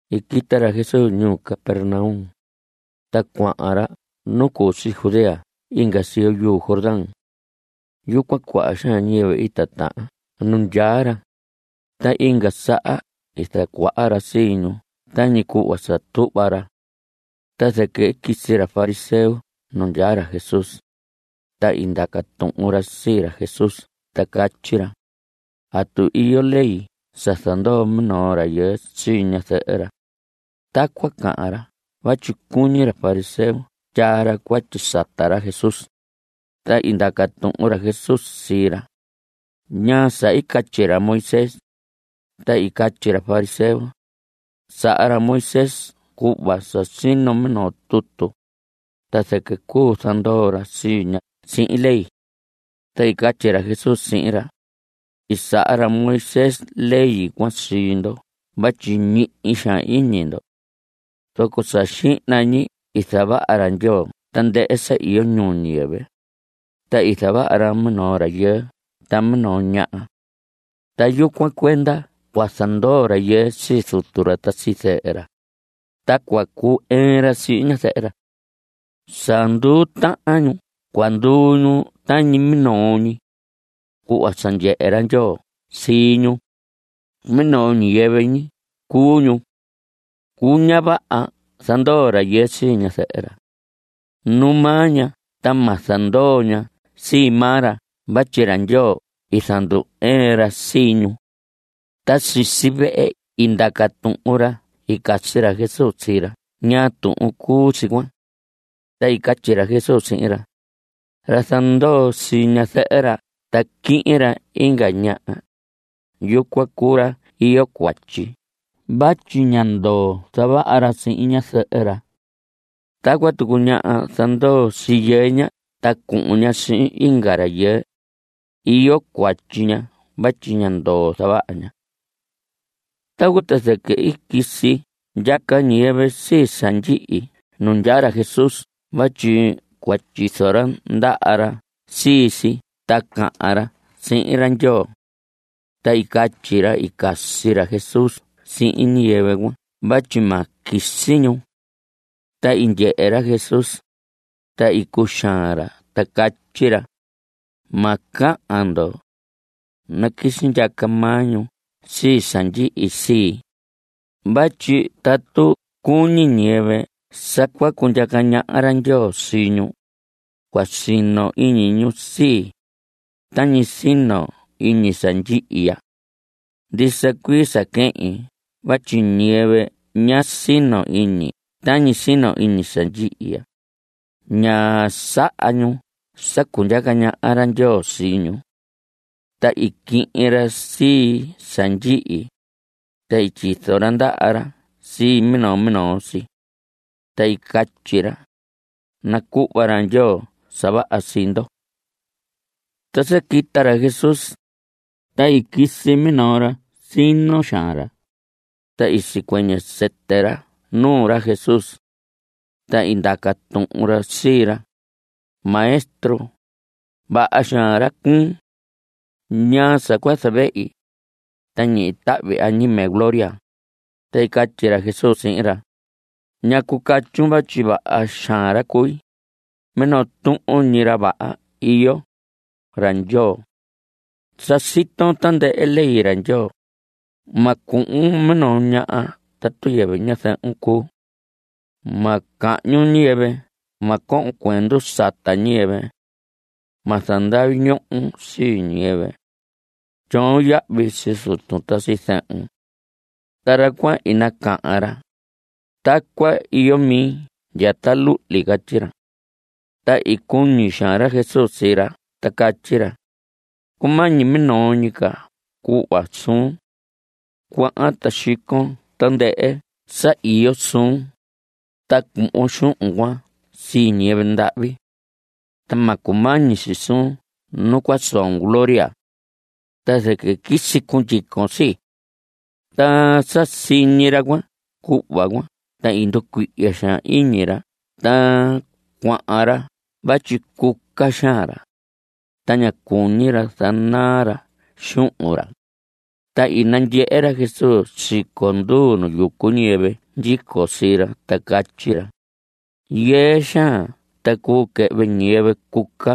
I quita ra Jesús ñuu Capernaum, ta cuahan ra nu cu si Judea inga siyo yuu Jordán. Yucuan, cuaha xaan ñiyɨvɨ i titahan nu ndyaa ra, ta inga saha i zacuaha ra sii ñu tañi cuhva sa tuhva ra. Ta zɨquɨ i quisi ra fariseo nu ndyaa ra Jesús, ta i ndaca tuhun ra sii ra Jesús ta catyi ra: ¿Atu iyo ley sa zandoo minoo rayɨɨ sii ñazɨhɨ ra? Tacuan cahan ra vatyi cuñi ra fariseo tyaa ra cuatyi sata ra Jesús. Ta i ndaca tuhun ra Jesús sii ra: ¿Ñaa sa i catyi ra Moisés? Ta i catyi ra fariseo: Saha ra Moisés cuhva sa sino minoo tutu, ta zɨquɨ cuu zandoo ra sii ña sihin ley. Ta i catyi ra Jesús sihin ra: I saha ra Moisés ley cuan sii ndo vatyi ñihi xaan iñi ndo. Zoco sa xihna ñi i zavaha ra Ndyoo tandɨhɨ sa iyo ñuu ñiyɨvɨ, ta i zavaha ra minoo rayɨɨ ta minoo ñaha. Ta yucuan cuenda cua zandoo rayɨɨ sii zutu ra ta sii zɨhɨ ra, ta cua cu‑ɨɨn ra sihin ñazɨhɨ ra. Sa nduu tahan ñu cua nduu ñu tañi minoo ñi. Cuhva sa ndyehe ra Ndyoo sii ñu, minoo ñi ñiyɨvɨ cuu ñu. Cuu, ña vaha zandoo rayɨɨ sii ñazɨhɨ ra. Nu maa ña ta ma zandoo ña sii maa ra vatyi ra Ndyoo i zandu‑ɨɨn ra sii ñu. Ta sisi vehe i ndaca tuhun ra i casi ra Jesús sii ra ñaa tuhun cuu si cuan. Ta i catyi ra Jesús sihin ra: Ra zandoo sii ñazɨhɨ ra ta quihin ra inga ñaha, yucuan cuu ra iyo cuatyi vatyi ña ndoo zavaha ra sihin ñazɨhɨ ra. Tacuan tucu ñaha zandoo sii yɨɨ ña ta cuhun ña sihin inga rayɨɨ, iyo cuatyi ña vatyi ña ndoo zavaha ña. Tacuan ta zɨquɨ i quisi ndyaca ñiyɨvɨ sii sa ndyihi nu ndyaa ra Jesús vatyi cua tyizo ra ndaha ra sii si ta cahan ra sihin ra Ndyoo. Ta i catyi ra i casi ra Jesús sihin ñiyɨvɨ cuan vatyi ma quisi ñu. Ta i ndyehe ra Jesús, ta i cuxaan ra ta catyi ra: Ma cahan ndo. Naquisi ndyaca maa ñu sii sa ndyihi sii, vatyi tatu cuñi ñiyɨvɨ sa cua cundyaca ñaha ra Ndyoo sii ñu, cua sino iñi ñu sii, tañi sino iñi sa ndyihi ya. Ndisa cuii sa quehin vatyi ñiyɨvɨ ña sino iñi tañi sino iñi sa ndyihi ya, ña saha ñu sa cundyaca ñaha ra Ndyoo sii ñu. Ta i quihin ra sii sa ndyihi, ta i tyizo ra ndaha ra sii minoo minoo si. Ta i catyi ra: Nacuhva ra Ndyoo sa vaha sii ndo. Ta sa quita ra Jesús, ta i quisi minoo ra. Sino xaan ra, ta i sicuɨñɨ sɨtɨ ra nuu ra Jesús. Ta i ndaca tuhun ra sii ra: Maestro, vaha xaan ra cuun. ¿Ñaa sa cua zavehi, ta ñihi tahvi añime gloria? Ta i catyi ra Jesús sihin ra: ¿Ñacu catyun vatyi vaha xaan ra cui? Minoo tuhun ñi ra vaha iyo, ra Ndyoo. Sa siton tandɨhɨ ley ra Ndyoo: Ma cuhun minoo ñaha tatu yɨvɨ ñazɨhun cuu. Ma cahñun ñiyɨvɨ. Ma cohon cuendu sata ñiyɨvɨ. Ma zandavi ñohon sii ñiyɨvɨ. Tyoon yahvi sii zutun ta sii zɨhun. Ta ra cuan i nacahan ra: Tacuan iyo mi ndya ta luhli. Catyi ra. Ta i cuñi xaan ra Jesús sii ra ta catyi ra: Cumañi minoo ñi ca cuhva suun. Cuahan ta xicon tandɨhɨ sa iyo suun, ta cuhvon xuhun cuan sii ñiyɨvɨ ndahvi. Ta ma cumañi si suun nu cua soon gloria. Ta zɨquɨ quisi cundyicon sii. Ta sa siñi ra cuan cuhva cuan ta i nducuihya xaan iñi ra ta cuahan ra vatyi cuca xaan ra (ta ñá cuñi ra sa zanaa ra xuhun ra). Ta i nandyehe ra Jesús siconduu nu yucu ñiyɨvɨ ndyico sii ra ta catyi ra: Yɨɨ xaan ta cuu quɨhvɨ ñiyɨvɨ cuca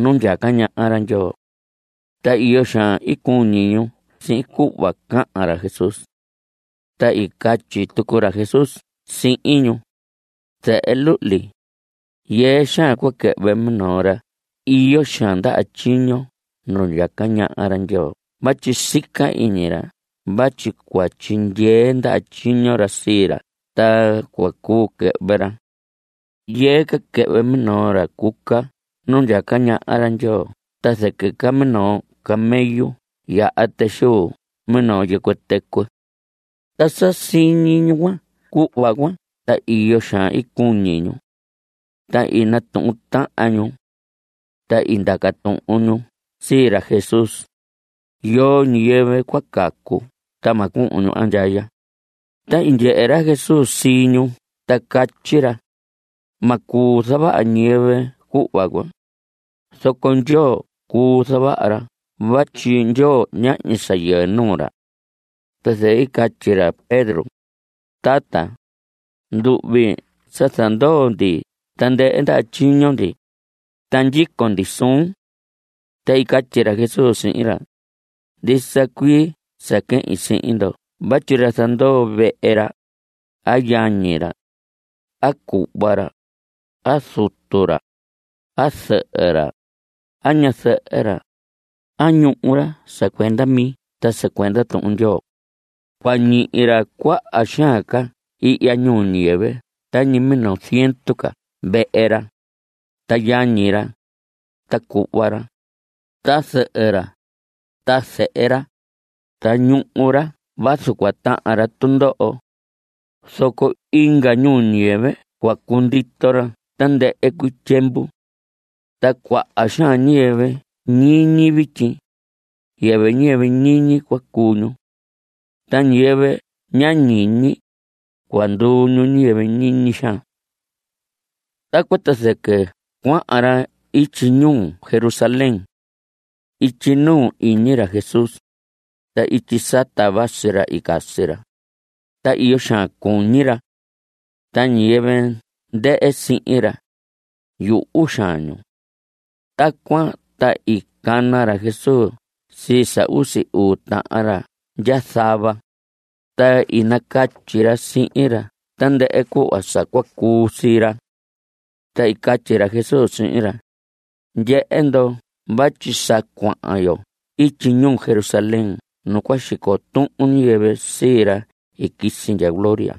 nu ndyaca ñaha ra Ndyoo. Ta iyo xaan i cuñi ñu sihin cuhva cahan ra Jesús. Ta i catyi tucu ra Jesús sihin ñu: Zehe luhli, yɨɨ xaan cua quɨhvɨ minoo ra iyo xaan ndaha tyiño nu ndyaca ñaha ra Ndyoo vatyi sica iñi ra vatyi cua tyindyee ndaha tyiño ra sii ra ta cua cuu quɨhvɨ ra. Yɨɨ ca quɨhvɨ minoo ra cuca nu ndyaca ñaha ra Ndyoo ta zɨquɨ ca minoo camello yaha tɨ xuu minoo yɨcuɨ tɨcuɨ. Ta sa siñi ñu cuan cuhva cuan ta iyo xaan i cuñi ñu. Ta i natuhun tahan ñu. Ta i ndaca tuhun ñu sii ra Jesús: ¿Yoo ñiyɨvɨ cua cacu ta ma cuhun ñu andyaya? Ta i ndyehe ra Jesús sii ñu ta catyi ra: Ma cuu zavaha ñiyɨvɨ cuhva cuan, zoco Ndyoo cuu zavaha ra vatyi Ndyoo ñahñi sa yɨɨ nuu ra. Ta zɨquɨ i catyi ra Pedro: Tata, nduhvi sa zandoo ndi tandɨhɨ ndaha tyiño ndi, ta ndyico ndi suun. Ta i catyi ra Jesús sihin ra: Ndisa cuii sa quehin sihin ndo vatyi ra zandoo vehe ra, a yañi ra, a cuhva ra, a zutu ra, a zɨhɨ ra, a ñazɨhɨ ra, a ñuhu ra sa cuenda mi ta sa cuenda Tuhun Ndyoo cua ñihi ra cuaha xaan ca ihya ñuu ñiyɨvɨ tañi minoo ziendu ca vehe ra, ta yañi ra, ta cuhva ra, ta zɨhɨ ra, ta zehe ra, ta ñuhu ra vazu cua tahan ra tundoho. Zoco inga ñuu ñiyɨvɨ cua cundito ra tandɨhɨ cuii tyiemvu. Ta cuaha xaan ñiyɨvɨ ñiñi vityi, yɨvɨ ñiyɨvɨ ñiñi cua cuu ñu. Ta ñiyɨvɨ ña ñiñi, cua nduu ñu ñiyɨvɨ ñiñi xaan. Tacuan ta zɨquɨ cuahan ra ityi ñuu Jerusalén. Ityi nuu iñi ra Jesús, ta ityi sata vasi ra i casi ra, ta iyo xaan cuñi ra. Ta ñiyɨvɨ ndɨhɨ sihin ra, yuhu xaan ñu. Tacuan ta i cana ra Jesús sii sa usi uu tahan ra ndya zava, ta i nacatyi ra sihin ra tandɨhɨ cuhva sa cua cuu sii ra. Ta i catyi ra Jesús sihin ra: Ndyehe ndo vatyi sa cuahan yo ityi ñuu Jerusalén nu cua xico tuhun ñiyɨvɨ sii ra i quisi ndya gloria.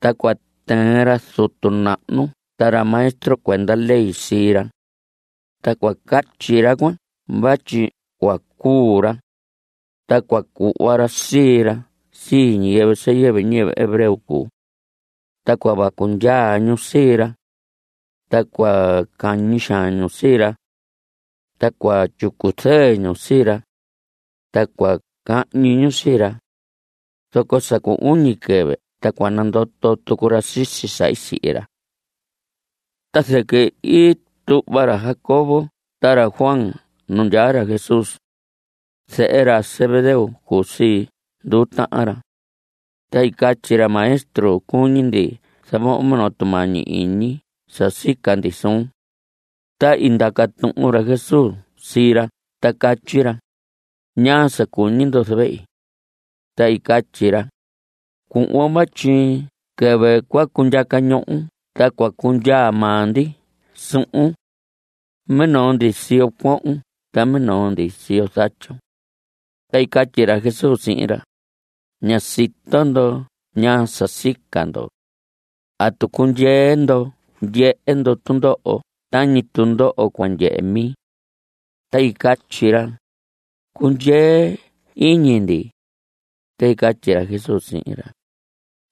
Ta cua tɨɨn ra zutu nahnu ta ra maestro cuenda ley sii ra. Ta cua catyi ra cuan vatyi cua cuu ra. Ta cua cuhva ra sii ra sii ñiyɨvɨ sa yɨvɨ ñiyɨvɨ hebreo cuu. Ta cua vacu ndyaa ñu sii ra. Ta cua cañi xaan ñu sii ra. Ta cua tyicu zɨɨ ñu sii ra. Ta cua cahñi ñu sii ra. Zoco sa cu uñi quɨvɨ ta cua nandoto tucu ra sisi sa i sihi ra. Ta zɨquɨ i tuhva ra Jacobo ta ra Juan nu ndyaa ra Jesús. Zehe ra Zebedeo cuu sii nduu tahan ra. Ta i catyi ra: Maestro, cuñi ndi zavohon minoo tumañi iñi sa sica ndi suun. Ta i ndaca tuhun ra Jesús sii ra ta catyi ra: ¿Ñaa sa cuñi ndo zavehi? Ta i catyi ra: Cuhvon vatyi quɨvɨ cua cundyaca ñohon ta cua cundyaa maa ndi suhun. Minoo ndi siyo cuohon ta minoo ndi siyo zatyun. Ta i catyi ra Jesús sihin ra: Ña sito ndo ñaa sa sica ndo. ¿Atu cundyee ndoho ndyehe ndo tundoho tañi tundoho cua ndyehe mi? Ta i catyi ra: Cundyee iñi ndi. Ta i catyi ra Jesús sihin ra: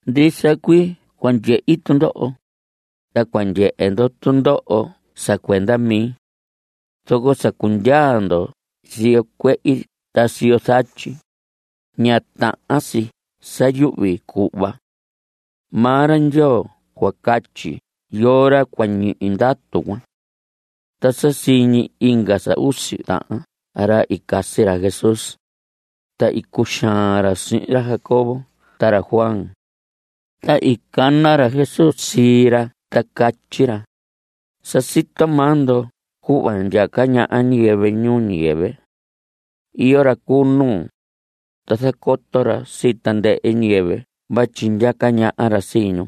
Ndisa cuii cua ndyehi tundoho, ta cua ndyehe ndo tundoho sa cuenda mi. Zoco sa cundyaa ndo siyo cuehi ta siyo zatyi, ña tahan si sa yuhvi cuhva. Maa ra Ndyoo cua catyi yoo ra cua ñihi ndatu cuan. Ta sa siñi inga sa usi tahan ra i casi ra Jesús, ta i cuxaan ra sihin ra Jacobo ta ra Juan. Ta i cana ra Jesús sii ra ta catyi ra: Sa sito maa ndo cuhva ndyaca ñaha ñiyɨvɨ ñuu ñiyɨvɨ. Iyo ra cu nuu, ta zacoto ra sii tandɨhɨ ñiyɨvɨ vatyi ndyaca ñaha ra sii ñu.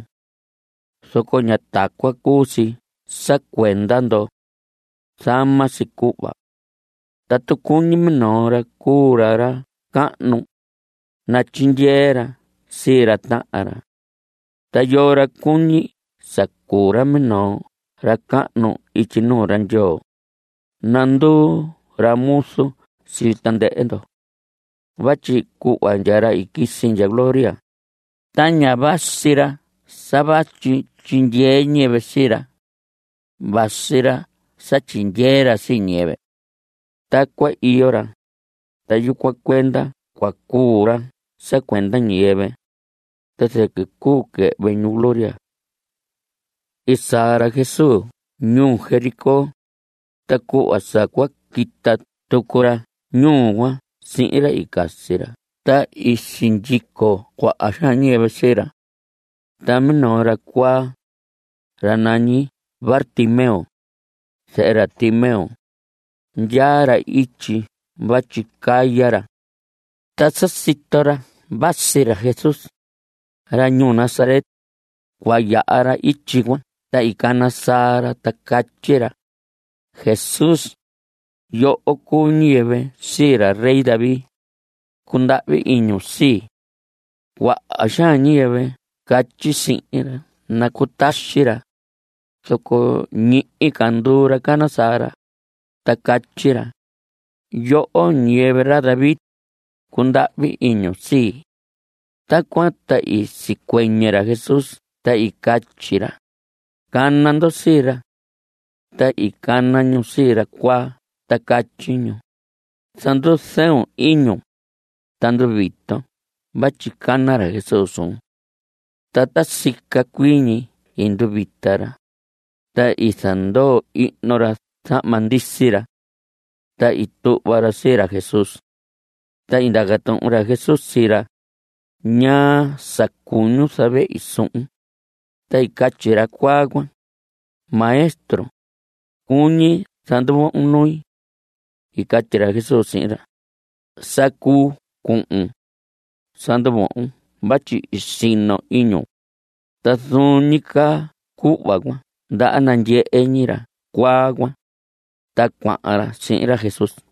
Zoco ña tacuan cuu si sa cuenda ndoho. Zama si cuhva. Tatu cuñi minoo ra cuu ra ra cahnu, natyindyee ra sii ra tahan ra. Ta yoo ra cuñi sa cuu ra minoo ra cahnu ityi nuu ra Ndyoo, nanduu ra muzu sii tandɨhɨ ndo. Vatyi cuhva ndya ra i quisi ndya gloria, ta ña vasi ra sa vatyi tyindyee ñiyɨvɨ sii ra. Vasi ra sa tyindyee ra sii ñiyɨvɨ. Tacuan iyo ra. Ta yucuan cuenda cua cuu ra sa cuenda ñiyɨvɨ, ta zɨquɨ cuu quɨhvɨ ñu gloria. I saa ra Jesús ñuu Jericó, ta cuhva sa cua quita tucu ra ñuu cuan sihin ra i casi ra ta i sindyico cuaha xaan ñiyɨvɨ sii ra. Ta minoo ra cuaa, ra nañi Bartimeo, zehe ra Timeo, ndyaa ra ityi vatyi caya ra. Ta sa sito ra vatyi ra Jesús, ra ñuu Nazaret, cua yaha ityi cuan ta i cana saa ra ta catyi ra: ¡Jesús, yoho cuu ñiyɨvɨ sii ra rey David, cundahvi iñun sii! Cuaha xaan ñiyɨvɨ catyi sihin ra nacutaxi ra, zoco ñihi ca nduu ra cana saa ra, ta catyi ra: ¡Yoho ñiyɨvɨ ra David, cundahvi iñun sii! Tacuan ta i sicuɨñɨ ra Jesús ta i catyi ra: Cana ndo sii ra. Ta i cana ñu sii ra cuaa ta catyi ñu: Zanduzɨɨ iñun, ta nduviton vatyi cana ra Jesús suun. Ta ta sica cuii ñi i nduvita ra, ta i zandoo ihno ra zahma ndisi ra. Ta i tuhva ra sii ra Jesús. Ta i ndaca tuhun ra Jesús sii ra: ¿Ñaa sa cuñun zavehi suhun? Ta i catyi ra cuaa cuan: Maestro, cuñi zanduvohon nui. I catyi ra Jesús sihin ra: Sa cuu cuhun. Sa nduvohon vatyi i sino iñun. Ta zuun ñi caa cuhva cuan ndaha nandyehe ñi ra cuaa cuan. Ta cuahan ra sihin ra Jesús.